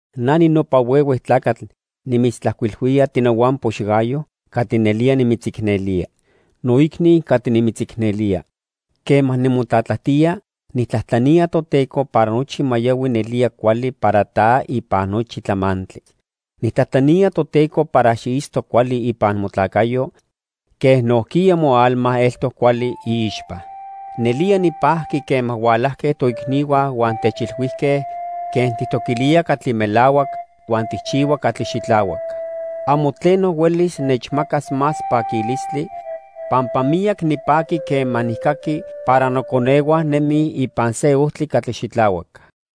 Na ninopa huehue tlacatl nimitztlajcuilhuía, tinohuampox Gayo, catli nelía nimitzicnelía. Noicni catli nimitzicnelía, quema nimotlatlajtía, nijtlajtlanía Toteco para nochi ma yohui nelía cuali para ta ipan nochi tlamantli. Nijtlajtlanía Toteco para xiitzto cuali ipan motlacayo quen nojquiya moalma eltoc cuali iixpa. Nelía nipajqui quema hualajque toicnihua huan techilhuijque quen tijtoquilía catli melahuac huan tijchihua catli xitlahuac. Amo tleno huelis nechmacas más paquilistli, pampa miyac nipaqui quema nijcaqui para noconehua nemij ipan se ojtli catli xitlahuac.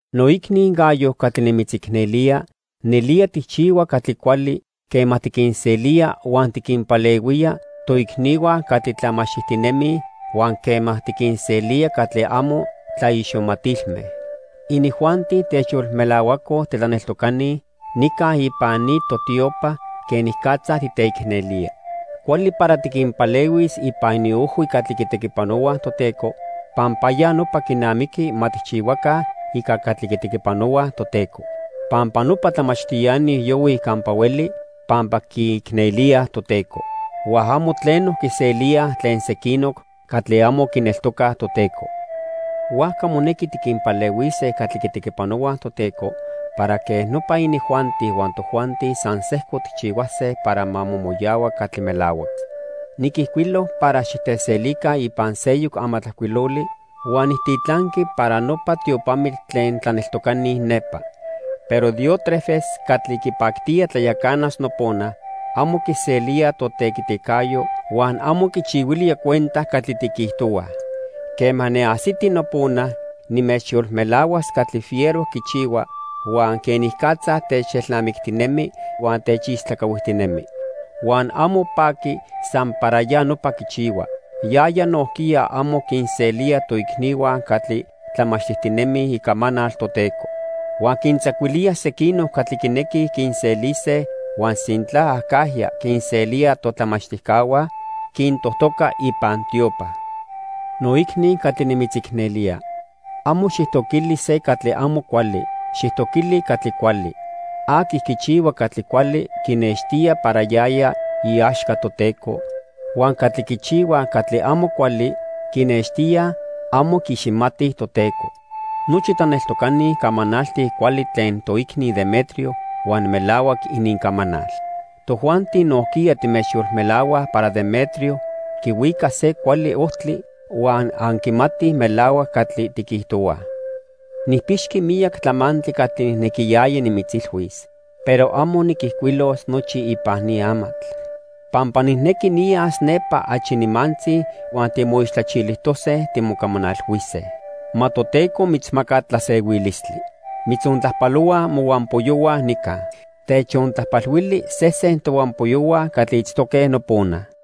Noicni Gayo catli nimitzicnelía, nelía tijchihua catli cuali quema tiquinselía huan tiquinpalehuía toicnihua catli tlamachtijtinemij, huan quema tiquinselía catli amo tlaiximatilme. Inijuanti techyolmelahuacoj titlaneltocani nica ipan ni totiopa quenicatza titeicnelía. Cuali para tiquinpalehuis ipan iniojhui catli quitequipanohuaj Toteco, pampa ya nopa quinamiqui ma tijchihuaca ica catli quitequipanohuaj Toteco. Pampa nopa tlamachtiani yohuij campa hueli pampa quiicnelíaj Toteco. Huan amo tleno quiselíaj tlen sequinoc catli amo quineltocaj Toteco. Huajca monequi tiquinpalehuise catli quitequipanohuaj Toteco para quej nopa inijuanti huan tojuanti san sejco tijchihuase para ma momoyahua catli melahuac. Niquijcuilo para xiteselica ipan seyoc amatlajcuiloli huan nijtitlanqui para nopa tiopamitl tlen tlaneltocani nepa. Pero Diótrefes catli quipactía tlayacanas nopona, amo quiselía totequiticayo huan amo quichihuilía cuenta catli tiquijtohuaj. Quema niajsiti nopona, nimechyolmelahuas catli fiero quichihua, huan quenicatza techelnamictinemi huan techistlacahuijtinemi. Huan amo paqui san para ya nopa quichihua, yaya nojquiya amo quinselía toicnihua catli tlamachtijtinemij icamanal Toteco. Huan quintzacuilía sequinoc catli quinequij quinselise, huan sintla acajya quinselía totlamachtijcahua, quintojtoca ipan tiopa. Noicni catli nimitzicnelía, amo xijtoquili se catli amo cuali. Xijtoquili catli cuali. Aqui quichihua catli cuali quinextía para yaya iaxca Toteco, huan catli quichihuaj catli amo cuali quinextíaj amo quiiximatij Toteco. Nochi tlaneltocani camanaltij cuali tlen toicni Demetrio huan melahuac inincamanal. Tojuanti nojquiya timechyolmelahuaj para Demetrio quihuica se cuali ojtli huan anquimatij melahuac catli tiquijtohuaj. Nijpixqui miyac tlamantli catli nijnequiyaya nimitzilhuis, pero amo niquijcuilos nochi ipan ni amatl. Pampa nijnequi niyas nepa achi nimantzi huan timoixtlachilijtose timocamanalhuise. Ma Toteco mitzmaca tlasehuilistli. Mitzontlajpalohuaj mohuampoyohua nica. Techontlajpalhuili sesen tohuampoyohua catli itztoque nopona.